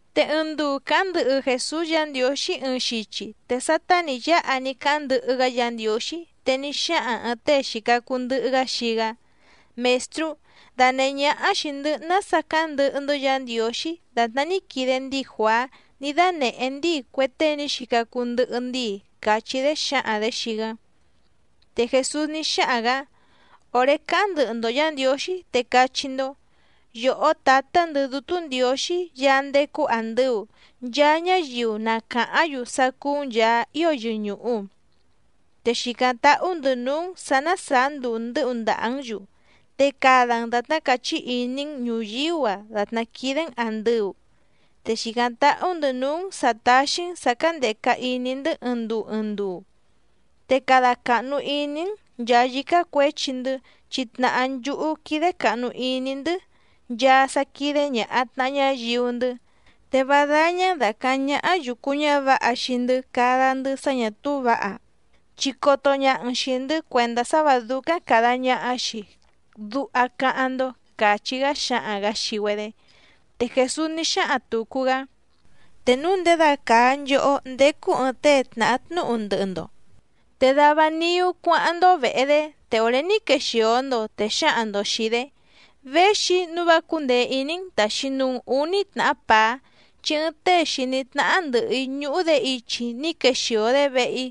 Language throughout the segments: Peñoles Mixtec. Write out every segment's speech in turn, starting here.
Te ɨɨⁿ nduu càháⁿ ndɨhɨ Jèsús Yǎ Ndiǒxí ɨɨⁿ xichi, te sátá nǐ yáha ní cáháⁿ ndɨhɨ‑gá Yǎ Ndiǒxí, te ní xáhaⁿ ɨ̀ɨⁿ tée xìca cuu ndɨhɨ‑gá xii‑gá: —Mèstrú, danèhé ñáhá xìi‑ndɨ́ nása cáháⁿ ndɨhɨ‑ndɨ́ Yǎ Ndiǒxí dàtná ní quide ndíi Juàá ní dánèhé ndíi cue tée ní xica cuu ndɨhɨ ndíi —càchí‑dé xǎhaⁿ‑dě xii‑gá. Te Jèsús ní xáhaⁿ‑gǎ: —Òré cáháⁿ ndɨhɨ‑ndo Yǎ Ndiǒxí, te cachí‑ndó: Yòhó tǎtá‑ndɨ̌ Dútú Ndiǒxí Yaá ndécú àndɨu, nchaa ñáyiu na càháⁿ‑yu sá cúú‑n Yàá ío yɨñùhu. Te xìcáⁿ táhú‑ndɨ̌ núú‑n sǎ ná sàá nduu ndɨ́hu ndàhá‑n‑yu. Te cada‑n dàtná càchí iní‑n ñùyíú‑a dàtná quídé‑n àndɨu. Te xìcáⁿ táhú‑ndɨ̌ núú‑n sǎ táxí‑n sǎ cándèca iní‑ndɨ́ ɨɨⁿ nduu ɨɨⁿ nduu. Te cada càhnu iní‑n nchàa yícá cuěchi‑ndɨ́, chi tnàhá nchúhú quídé càhnu iní‑ndɨ́ nchaa sá quídé ñàha tnaha ñáyiu‑ndɨ́. Te vá dáñá‑n dàcaháⁿ ñáhá yùcu ñávǎha xii‑ndɨ́ cada‑ndɨ́ sá ñà túú vǎha, chi coto ñaha‑n xìi‑ndɨ́ cuèndá sá vǎ dúcáⁿ càda ñaha‑xi, duha cáháⁿ‑ndó —càchí‑gá xáhaⁿ‑gǎ xii‑güedé. Te Jèsús ní xáhaⁿ tùcu‑gá: —Te núu ndědacàa nchohó ndécú ɨ̀ɨⁿ tée tnàha tnúhu ndɨhɨ‑ndo, te dava niú cuáháⁿ‑ndó vèhe‑dé, te òré ní quexìo‑ndo, te xǎhaⁿ‑ndo xìi‑dé: “Véxi‑í nǔu vá cúndèe iní‑n tàxi nuu‑n úní tnàhá pàá, chi ɨɨⁿ tée xìní tnáhá ndɨ̀hɨ‑í ñúhú‑dě ichi ní quexìo‑dé vehe‑í,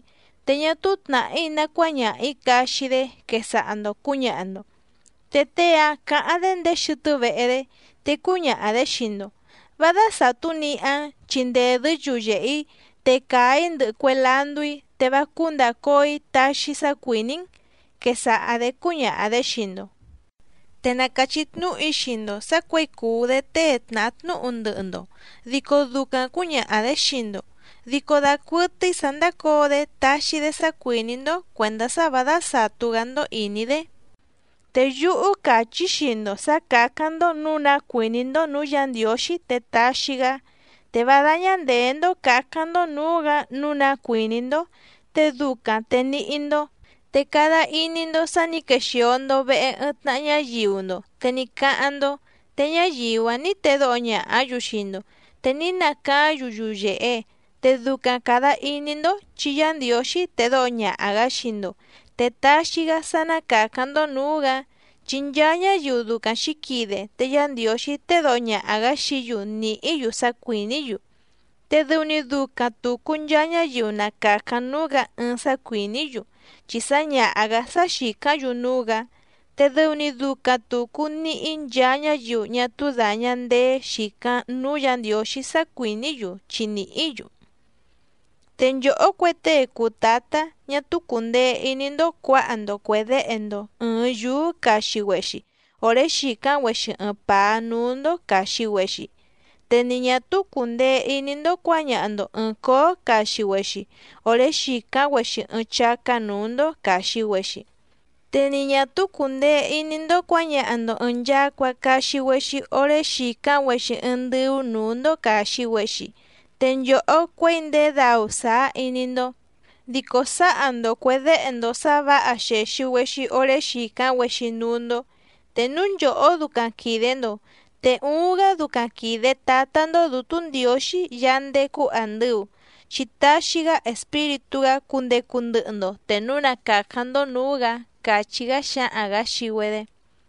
te ñá túú tnàhí ná cuáñaha‑ǐ caxi‑dé”, quesaha‑ndo cǔñaha‑ndo. Te tée‑áⁿ cǎháⁿ‑dé ndéé xɨtɨ́ vehe‑dé, te cúñaha‑dě xii‑ndo: “Vá dásàtú nihá‑n chi ndèdɨ́ yuyèhe‑í, te càa‑í ndɨhɨ cue landú‑í, te vá cúú ndàcóo‑í taxi‑í sá cuìní‑n”, quesaha‑dě cúñaha‑dě xii‑ndo. Te na càchí tnúhu‑í xii‑ndo sǎ cuěi cùu‑dé tée tnàha tnúhu ndɨhɨ‑ndo, dico ducaⁿ cǔñaha‑dě xii‑ndo, dico dacuɨtɨ́í sǎ ndácǒo‑dé taxi‑dé sá cuìní‑ndó cuèndá sá vǎ dásàtú‑gá‑ndó ìní‑dé. Te yúhú càchí‑í xii‑ndo sǎ cǎcáⁿ‑ndó nǔu ná cuìní‑ndó nǔú Yǎ Ndiǒxí te taxi‑gá. Te vá dáñá ndèé‑ndó cǎcáⁿ‑ndó nǔú‑gǎ nǔu ná cuìní‑ndó, te ducaⁿ te níhí‑ndó. Te cada iní‑ndó sǎ nǐ quexìo‑ndo vehe ɨɨⁿ tnaha ñáyiu‑ndo te ní cáháⁿ‑ndó, te ñáyiu‑áⁿ nǐ tedóho ñàhá‑yu xii‑ndo te ní nacaáⁿ‑yu yuyèhe. Te ducaⁿ càda iní‑ndó chi Yá Ndiǒxí tedóho ñaha‑gǎ xii‑ndo, te taxi‑gá sá ná càcáⁿ‑ndó nǔú‑gǎ. Chi nchaa ñáyiu ducaⁿ xǐquide te Yá Ndiǒxí tédǒho ñaha‑gǎ xií‑yu nìhí‑yu sá cuìní‑yu. Te dɨu‑ni ducaⁿ tùcu nchaa ñáyiu na càcáⁿ núú‑gǎ ɨɨⁿ sá cuìní‑yu, chi sǎñaha‑gǎ sá xìcáⁿ‑yu núú‑gǎ. Te dɨu‑ni ducaⁿ tùcu níhí nchaa ñáyiu ñá túú dàña ndeé xìcáⁿ núú Yǎ Ndiǒxí sá cuìní‑yu, chi nìhí‑yu. ’Te nchòhó cue tée cùu tátá ñá túú cùndee iní‑ndó cuǎha‑ndo cuè déhe‑ndo ɨ̀ɨⁿ yúú caxi‑güexi òré xìcáⁿ‑güexi ɨɨⁿ pàá núú‑ndó càxi‑güexi, te ni ñà túú cùndee iní‑ndó cuǎñaha‑ndo ɨ̀ɨⁿ cóó caxi‑güexi òré xìcáⁿ‑güexi ɨɨⁿ chácá nǔú‑ndó càxi‑güexi. Te ni ñà túú cùndee iní‑ndó cuǎñaha‑ndo ɨ̀ɨⁿ nchacua caxi‑güexi oré xìcáⁿ‑güexi ɨɨⁿ ndɨ́ú nǔú‑ndó càxi‑güexi. Te nchòhó cuěi ndèé dau sàá iní‑ndó, dico sǎha‑ndo cuè déhe‑ndo sǎ vǎha xèxi‑güexi oré xìcáⁿ‑güexi núú‑ndó. Te núu nchòhó ducaⁿ quìde‑ndo, ¡te uuⁿ‑gá ducaⁿ quìde Tátá‑ndó Dǔtú Ndiǒxí Yaá ndécú àndɨu, chi taxi‑gá Espíritú‑gá cundecu ndɨhɨ‑ndo te núu na càcáⁿ‑ndó nǔú‑gǎ! —càchí‑gá xáhaⁿ‑gǎ xii‑güedé.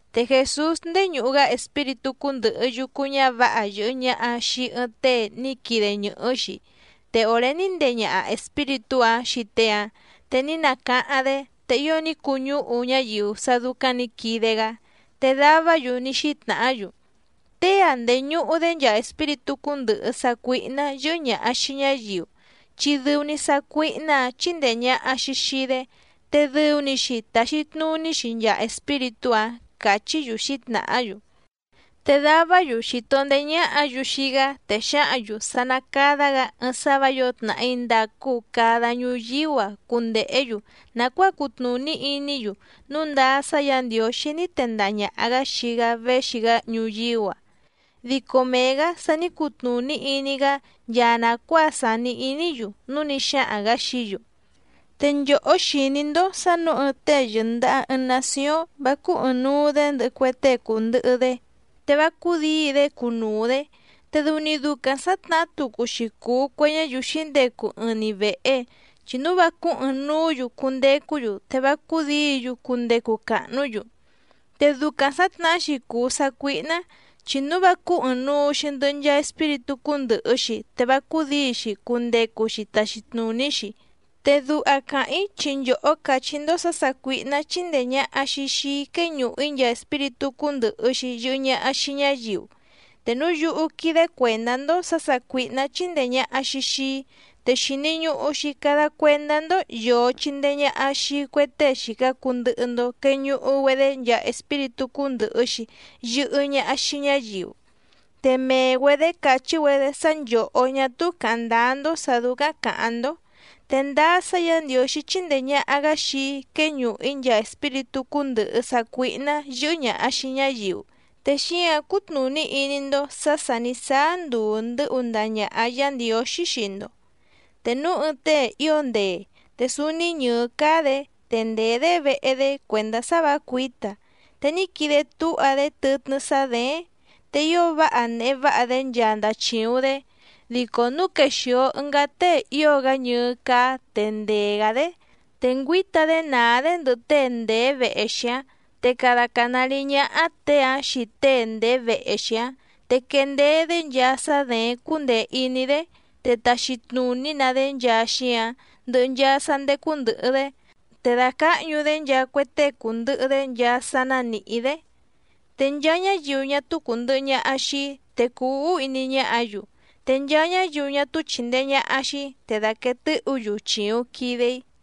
Te Jèsús ndéñùhu‑gá espíritú cúndɨ̀hɨ yucu ñávǎha yɨ̀hɨ ñaha xii ɨɨⁿ tée ní quide ñɨ̀hɨ́‑xi, te òré ní ndee ñaha espíritú‑áⁿ xii tée‑áⁿ, te ní nacáháⁿ‑dé. Te ío ní cuñúhu ñáyiu sá dúcáⁿ nǐ quide‑gá. Te davá‑yu ní xítnàhá‑yu: —Tée‑a ndèñuhu‑dé nchaa espíritú cúndɨ̀hɨ sácuíhná yɨ́hɨ́ ñàha xii ñáyiu, chi dɨu‑ni sácuíhná‑ǎⁿ chíndèe ñaha‑xi xii‑dé, te dɨu‑ni‑xi tàxi tnuní‑xi nchaa espíritú‑áⁿ —càchí‑yu xǐtnàhá‑yu. Te davá‑yu xìto ndeé ñáhǎ‑yu xii‑gá, te xǎhǎⁿ‑yu sá ná cádá‑gǎ ɨɨⁿ sá vǎ yǒo tnàhí ndàcu cada ñuyíú‑a cundèhé‑yu nàcuáa cutnùní iní‑yu núu ndáá sá Yǎ Ndiǒxí ní tendaha ñàha‑gá xii‑gá véxi‑gá ñuyíú‑a. Dico mee‑gǎ sa ní cutnùní iní‑gá nchaa nàcuáa sàni iní‑yu, núu ní xáhaⁿ‑gǎ xií‑yu: —Te nchòhó xìní‑ndó sǎ nǔu ɨɨⁿ tée yɨ̀ndaha ɨɨⁿ nacióⁿ vá cúú ɨ̀ɨⁿnuu‑dé ndɨhɨ cue tée cùndɨhɨ‑dé, te vá cúdǐi‑dé cunuu‑dě. Te dɨu‑ni ducaⁿ sǎtnahá tucu‑xi cùu cue ñáyiu xǐndecu ɨɨⁿ‑ni vèhe, chi núu vá cúú ɨ̀ɨⁿnuú‑yu cundecú‑yu, te vá cúdǐi‑yu cundecu càhnú‑yu. Te ducaⁿ sǎtnahá‑xi cùu sácuíhná, chi núu vá cúú ɨ̀ɨⁿnuu‑xi ndɨhɨ nchaa espíritú cúndɨ̀hɨ‑xi te vá cúdǐi‑xi cundecu‑xi taxi tnùní‑xi. Te duha càháⁿ‑í chi nchòhó càchí‑ndó sǎ sàcuíhná chíndèe ñaha‑xi xii‑í quéñùhu‑í nchaa espíritú cúndɨ̀hɨ‑xi yɨhɨ ñaha xii ñáyiu. Te núu yúhú quídé cuèndá‑ndó sǎ sàcuíhná chíndèe ñaha‑xi xii‑í, te xìni ñuhu‑xi cada cuendá‑ndó yòo chindee ñaha xii cue tée xìca cuu ndɨhɨ‑ndo queñuhu‑güedé nchaa espíritú cúndɨ̀hɨ‑xi yɨhɨ ñaha xii ñáyiu. Te mee‑güedě càchí‑güedé sá nchòhó ñá túú càháⁿ ndáá‑ndó sǎ dúcáⁿ càháⁿ‑ndó. Te ndáá sá Yǎ Ndiǒxí chíndèe ñaha‑gá xii‑í quéñùhu‑í nchaa espíritú cúndɨ̀hɨ sácuíhná yɨ́hɨ́ ñàha xii ñáyiu, te xíǎⁿ cutnùní iní‑ndó sǎ sà ní sáá nduu ndɨ́hu ndaha ñàha Yá Ndiǒxí xii‑ndo. ’Te núu ɨɨⁿ tée ío ndee, te súúní ñɨ̀ɨ́ cáá‑dě, te ndèé‑dé vehe‑dé cuèndá sá vǎ cuǐta, te ní quide túha‑dé tɨtnɨ́ sá děéⁿ, te ío váha nèhe váha‑dé nchaa ndachìuⁿ‑dé. Dico núu quexìo ɨngá tée ío‑gá ñɨɨ́ cáá te ndee‑gǎ‑dé, te ngüíta‑dé nàá‑dé ndɨhɨ tée ndèé vehe‑xi‑áⁿ, te cada cànárí ñáhá těe‑áⁿ xii tée ndèé vehe‑xi‑áⁿ, te quendeé‑dé nchaa sá děéⁿ cúndèe iní‑dé, te taxi tnùní‑na‑dé nchaa xíǎⁿ, ndɨhɨ nchaa sá ndécú ndɨ̀hɨ‑dé, te dàcáhñu‑dé nchaa cue tée cùndɨhɨ‑dé nchaa sá ná nìhí‑dé. ’Te nchaa ñáyiu ñá túú cùndɨhɨ ñaha xii‑í, te cùu úhú iní ñáhǎ‑yu, te nchaa ñáyiu ñá túú chìndee ñaha xii‑í, te dàquee tɨ́hǔ‑yu chìuⁿ quide‑í.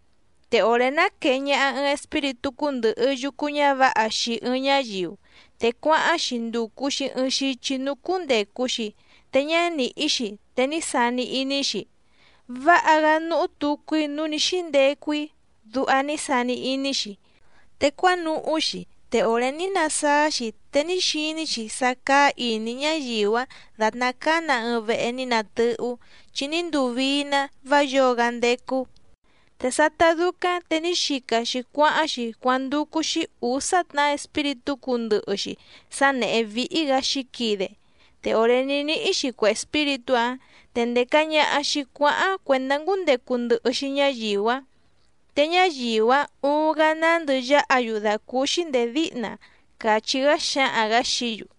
’Te òré ná quèe ñaha ɨɨⁿ espíritú cúndɨ̀hɨ yucu ñávǎha xii ɨɨⁿ ñáyiu, te cuáháⁿ‑xi ndùcu‑xi ɨɨⁿ xichi núú cúndècu‑xi te ñá nìhí‑xi, te ní sani iní‑xi: “Váha‑gá núhú tucu‑í núú nǐ xíndecu‑í”, duha ní sani iní‑xi. Te cuánuhú‑xi, te òré ní nasáá‑xi, te ní xiní‑xi sá cáá ìní ñáyiu‑áⁿ dàtná cáá‑nǎ ɨɨⁿ vehe ní natɨ́hú, chi ní nduu vii‑ná, vá yǒo‑gá ndécú. Te sátá dúcáⁿ te ní xica‑xi cuáháⁿ‑xi cuándúcú‑xí ǔsá tnàhá espíritú cúndɨ̀hɨ‑xi sá nèhé víhí‑gǎ xǐquide, te òré ní níhí‑xi cue espíritú‑áⁿ te ndèca ñaha‑xi cuáháⁿ cuèndá ngúndecu ndɨhɨ‑xi ñáyiu‑áⁿ, te ñáyiu‑áⁿ uuⁿ‑gá nándɨ yáha‑yu dàcúúxí ndèé díhna —càchí‑gá xáhaⁿ‑gǎ xií‑yu.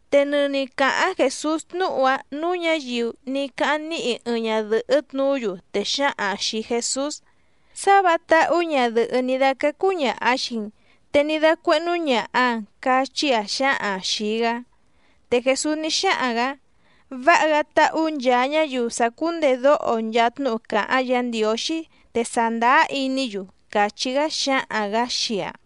Te nɨni càháⁿ Jèsús tnúhu‑áⁿ nǔú ñǎyiu ní cáháⁿ níhi ɨɨⁿ ñadɨ̀hɨ́ tnuú‑yu, te xǎhaⁿ‑aⁿ xìi Jesús: —¡Sá vǎha táhú ñadɨ̀hɨ́ ní dácácú ñàha xii‑n, te ní dácuéhnú ñàha‑aⁿ! —cachí‑aⁿ xǎhaⁿ‑aⁿ xìi‑gá. Te Jèsús ní xáhaⁿ‑gǎ: —¡Váha‑gá táhú nchàa ñáyiu sàcúndedóho nchaa tnúhu càháⁿ Yǎ Ndiǒxí te sàndáá iní‑yu! —càchí‑gá xáhaⁿ‑gǎ xii‑aⁿ.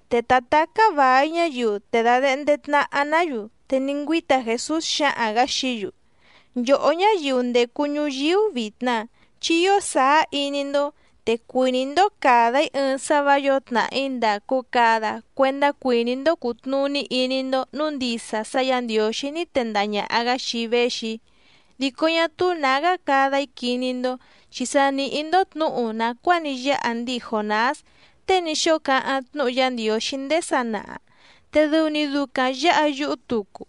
Te ta tàcá vài ñáyiu te dàdehnde tnaha‑ná‑yu, te ní ngüíta Jèsús xáhaⁿ‑gǎ xií‑yu: —Nchòhó ñáyiu ndècu ñuyíú vitna, chi ío sàá iní‑ndó, te cuìní‑ndó càda‑í ɨɨⁿ sá vǎ yǒo tnàhí ndàcu cada cuendá cuìní‑ndó cùtnuní iní‑ndó nǔu ndisa sá Yǎ Ndiǒxí ní tendaha ñàha‑gá xii‑í véxi‑í. Dico ñá túú nǎgá cada‑í quiní‑ndó, chi sa nìhí‑ndó tnǔhu nàcuáa ní yáha ndíi Jònás tée ní xóo cáháⁿ tnúhu Yá Ndiǒxí ndéé sanaha, te dɨu‑ni ducaⁿ yǎha yúhú tucu.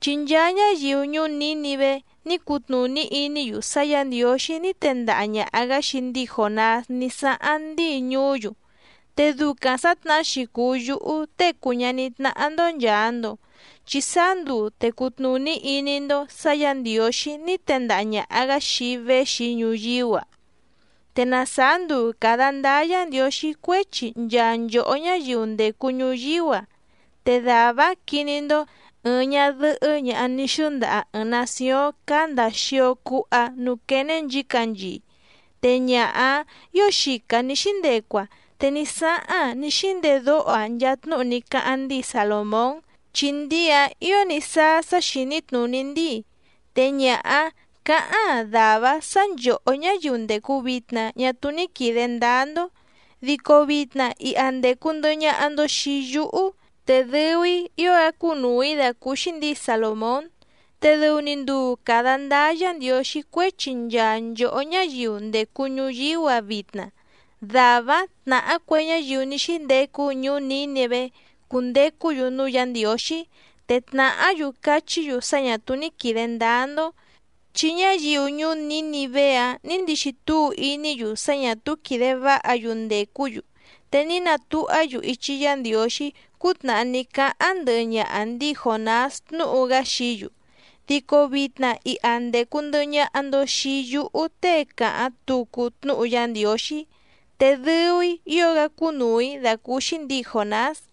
Chi nchaa ñáyiu ñuú Nǐnivé ní cutnùní iní‑yu sá Yǎ Ndiǒxí ní tendaha ñàha‑gá xii ndíi Jònás ní sáháⁿ ndíi ñuú‑yu. Te ducaⁿ sǎtnahá‑xi cùu yúhú Tée cùu ñaní tnáhá‑ndó nchàa‑ndo, chi sáá nduu te cutnùní iní‑ndó sǎ Yǎ Ndiǒxí ní tendaha ñàha‑gá xii‑í véxi‑í ñuyíú‑a. Te na sàá nduu càda ndáá Yǎ Ndiǒxí cuéchi nchaa nchòhó ñáyiu ndècu ñuyíú‑a, te dàvá‑áⁿ quiní‑ndó ɨ̀ɨⁿ ñadɨhɨ́ ñaha ní xɨ́ndaha ɨ̀ɨⁿ nacióⁿ cáá ndàa xio cuha núú quéné nchǐcanchii. Te ñaha‑áⁿ ǐo xica nǐ xíndecu‑aⁿ, te ní sáháⁿ‑aⁿ ní xíndedóho‑aⁿ nchaa tnúhu ní cáháⁿ ndíi Salòmón, chi ndíi‑áⁿ ǐo ní sáá sá xìní tnùní ndíi. Te ñaha‑áⁿ cǎháⁿ‑aⁿ dàvá‑áⁿ sǎ nchòhó ñáyiu ndècu vitna ñá túú ní quìde ndáá‑ndó. Dico vitna iha ndècu ndɨhɨ ñaha‑ndo xii yúhú, te dɨu‑í ío‑gá cúnùu‑í dàcúúxí ndǐi Salòmón. Te dɨu‑ni nduu càda ndáá Yǎ Ndiǒxí cuéchi nchaa nchòhó ñáyiu ndècu ñuyíú‑a vitna, dàvá‑áⁿ tnàhá cue ñáyiu ní xíndecu ñuú Nǐnivé cundecú‑yu núú Yǎ Ndiǒxí, te tnàhá‑yu cachí‑yu sá ñà túú ní quìde ndáá‑ndó. Chi ñáyiu ñuú Nǐnivé‑áⁿ nǐ ndixi túu iní‑yu sá ñà túú quìde váha‑yu ndècú‑yu te ní natuhá‑yu ichi Yá Ndiǒxí cútnàhá ní cáháⁿ ndɨhɨ ñaha ndíi Jònás tnúhu‑gá xií‑yu. Dico vitna iha ndècu ndɨhɨ ñaha‑ndo xii yúhú tée càháⁿ tucu tnúhu Yá Ndiǒxí, te dɨu‑í ío‑gá cúnùu‑í dàcúúxí ndǐi Jònás.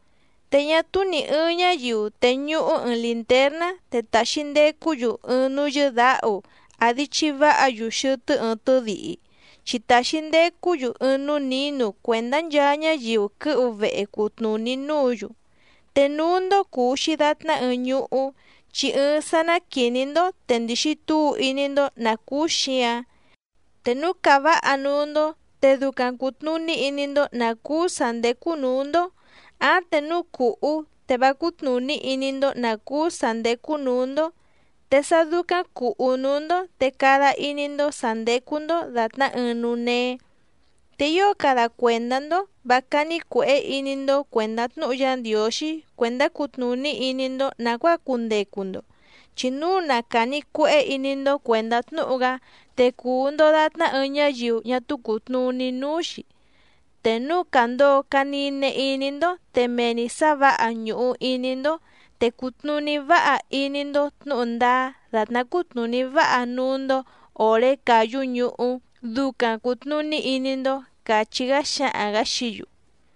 ’Te ñá túú nì ɨɨⁿ ñáyiu tèñuhú ɨɨⁿ lìntérná, te taxi ndecú‑yu ɨɨⁿ núú yɨ́dǎhu, àdi chiváha‑yu xɨtɨ́ ɨɨⁿ tɨ́dihi, chi tàxi ndecú‑yu ɨɨⁿ núú nǐnu cuèndá nchaa ñáyiu quɨ́hu vehe cutnùní núǔ‑yu. Te núú‑ndó cùu‑xi datná ɨɨⁿ ñuhú, chi ɨɨⁿ sá ná quìní‑ndó te ndìxi túu iní‑ndó nǎ cúú xǐǎⁿ, te núu càváha núú‑ndó, te ducaⁿ cùtnuní iní‑ndó nǎ cúú sǎ ndécú nǔú‑ndó, áⁿ te núu cùhú, te vá cútnùní iní‑ndó nǎ cúú sǎ ndécú nǔú‑ndó. Te sá dúcáⁿ cùhú núú‑ndó te cada iní‑ndó sǎ ndécú‑ndó dàtná ɨɨⁿ núú néé. Te ío cada cuèndá‑ndó vǎ cání cuèhé iní‑ndó cuèndá tnúhu Yá Ndiǒxí cuèndá cutnùní iní‑ndó nàcuáa cundecu‑ndo, chi núu na càni cuehé iní‑ndó cuèndá tnúhu‑gá, te cùu‑ndo datná ɨɨⁿ ñáyiu ñá túú cùtnuní núú‑xí. Te núu càndoo canine iní‑ndó, te mee‑ni sǎ vǎha ñùhu iní‑ndó, te cùtnuní váha iní‑ndó tnǔhu ndáá dàtná cútnùní váha núú‑ndó òré càyú ñuhú, ducaⁿ cùtnuní iní‑ndó —càchí‑gá xáhaⁿ‑gǎ xií‑yu.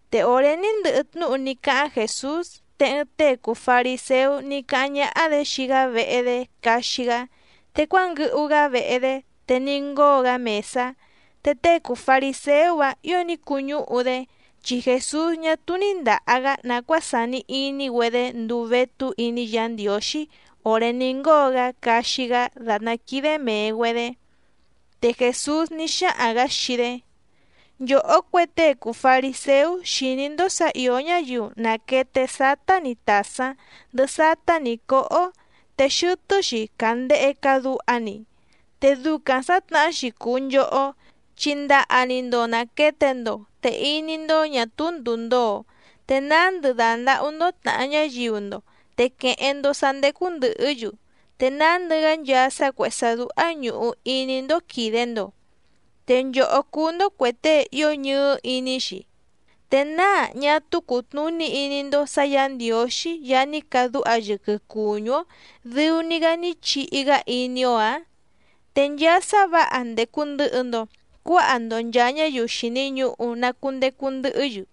Te òré ní ndɨhɨ tnúhu ní cáháⁿ Jèsús, te ɨɨⁿ tée cùu fariséú ní cáháⁿ ñáhá‑dě xii‑gá vehe‑dé caxi‑gá, te cuánguɨhu‑gá vehe‑dé, te ní ngóo‑gá mèsá. Te tée cùu fariséú‑áⁿ ǐo ní cuñúhu‑dé, chi Jèsús ñá túú ní ndàha‑gá nàcuáa sàni iní‑güedé nduu vétú iní Yǎ Ndiǒxí òré ní ngóo‑gá caxi‑gá dàtná quídé mèe‑güedé. Te Jèsús ní xáhaⁿ‑gǎ xii‑dé: —Nchòhó cue tée cùu fariséú xìní‑ndó sǎ ìó ñáyiu nàquete sátá‑ni tàsáⁿ ndɨhɨ sátá‑ni cǒhó, te xɨtɨ́‑xi càndehe caduha‑ni. Te ducaⁿ sǎtnahá‑xi cùu nchohó, chi ndaha‑ni‑ndo nàquete‑ndo, te iní‑ndó ñà túú ndùu ndoo, te nándɨ dàndahú‑ndó tnàha ñáyiu‑ndo, te quèheⁿ‑ndo sá ndécú ndɨ̀hɨ́‑yu, te nándɨ‑gá nchaa sá cuèhé sá dúhá ñùhu iní‑ndó quìde‑ndo. ¡Te nchòhó cúú‑ndó cuè tée ío ñɨɨ́ iní‑xi! ¿Te náa ñá túú cùtnuní iní‑ndó sǎ Yǎ Ndiǒxí Yaá ní cadúha yɨquɨ cùñú‑ó dɨu‑ni‑gá ní chihi‑gá iní‑ó‑ǎⁿ? Te nchaa sá vǎha ndècu ndɨhɨ‑ndo cuáha‑ndo nchàa ñáyiu xìni ñuhu na cundecu ndɨhɨ́‑yu,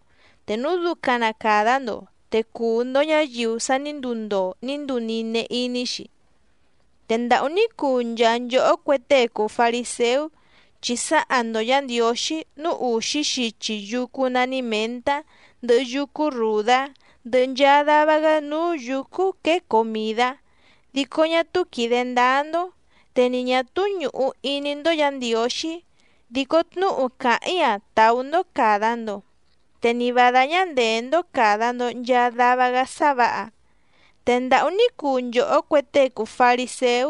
te núu ducaⁿ na càda‑ndo, te cuu‑ndo ñǎyiu sa ní nduu ndoo ní nduu nine iní‑xi. ’¡Te ndàhú ní cuu nchaa nchòhó cue tée cùu fariséú! Chi sǎha‑ndo Yǎ Ndiǒxí núú ùxí xichi yúcú nání mèntá, ndɨhɨ yúcú rùdá, ndɨhɨ nchaa dava‑gá núú yǔcú quěe comìdá, dico ñá túú quìde ndáá‑ndó, te ni ñà túú ñùhu iní‑ndó Yǎ Ndiǒxí. Dico tnúhu càháⁿ‑í‑a tàú‑ndó càda‑ndo, te ni vǎ dáñá ndèé‑ndó càda‑ndo nchaa dava‑gá sá vǎha. ’¡Te ndàhú ní cuu nchòhó cue tée cùu fariséú!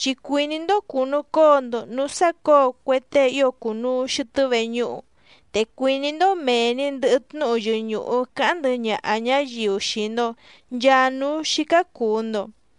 Chi cuìní‑ndó cùnucóo‑ndo nǔú sácǒo cue tée ío cùnuu xɨtɨ́ veñúhu, te cuìní‑ndó mèe‑ni ndɨhɨ tnúhu yɨñùhu cáháⁿ ndɨhɨ ñaha ñǎyiu xii‑ndo nchàa núú xícá cùu‑ndo.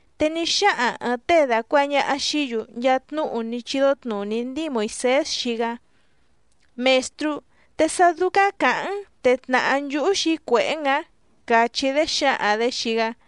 Te ní xáhaⁿ ɨ̀ɨⁿ tée dàcuaha ñaha xií‑yu nchaa tnúhu ní chídó tnùní ndíi Moìsés xii‑gá: —Mèstrú, te sá dúcáⁿ càháⁿ‑n te tnàhá nchúhú xǐcuèhé‑n ǎⁿ —càchí‑dé xǎhaⁿ‑dě xii‑gá.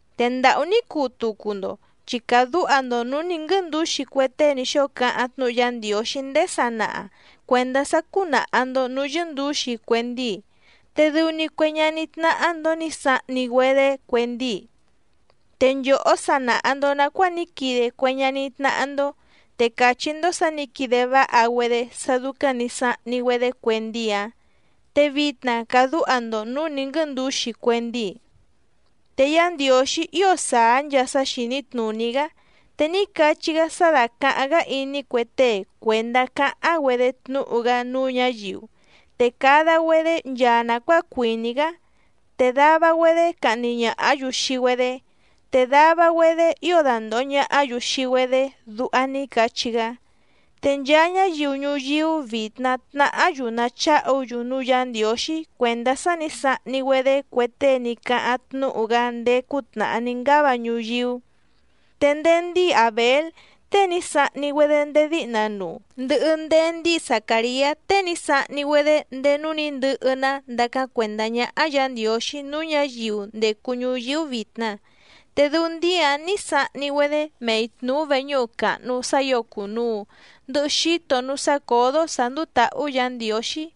’¡Te ndàhú ní cuu tucu‑ndo! Chi càdúha‑ndo nǔú nǐ nguɨ́ndǔxi cue tée ní xóo cáháⁿ tnúhu Yá Ndiǒxí ndéé sanaha cuèndá sá cúnàha‑ndo núú yɨ́ndǔxi cue ndíi, te dɨu‑ni cue ñaní tnáhá‑ndó nǐ sahni‑güedé cue ndíi. Te nchòhó sa nàha‑ndo nacuáa ní quide cue ñaní tnáhá‑ndó, te càchí‑ndó sǎ nǐ quide váha‑güedé sá dúcáⁿ nǐ sahni‑güedé cue ndíi‑áⁿ, te vitna càdúha‑ndo nǔú nǐ nguɨ́ndǔxi cue ndíi. ’Te Yá Ndiǒxí ío sàá nchaa sá xìní tnùní‑gá, te ní cachí‑gá sá dácàháⁿ‑gá iní cue tée cuèndá cáháⁿ‑güedé tnúhu‑gá núú ñǎyiu, te cada‑güedé nchaa nàcuáa cuìní‑gá, te dava‑güedé cahni ñàhá‑yu xii‑güedé, te dava‑güedé ío dandòho ñahá‑yu xii‑güedé duha ní cachí‑gá. Te nchaa ñáyiu ñuyíú vitna tnàhá‑yu nacháhu‑yu núú Yǎ Ndiǒxí cuèndá sá nǐ sahni‑güedé cue tée ní cáháⁿ tnúhu‑gá ndéé cútnàhá ní ngáva ñuyíú. Te ndéé ndíi Àbél tée ní sahni‑güedé ndéé díhna nuu, ndɨhɨ ndéé ndíi Zacàriá tée ní sahni‑güedé ndéé núú nǐ ndɨhɨ‑ná ndácáⁿ cuèndá ñáhá Yǎ Ndiǒxí núú ñǎyiu ndècu ñuyíú vitna, te dɨu ndíi‑áⁿ nǐ sahni‑güedé mei tnùú veñúhu càhnu sá ǐo cùnuu, ndɨhɨ xíto núú sácǒdó sǎ ndúú tǎhú Yǎ Ndiǒxí.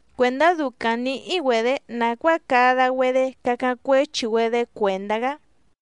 cuèndá ducaⁿ nǐhí‑güedě nàcuáa cada‑güedé cacáⁿ cuéchi‑güedé cuèndá‑gá.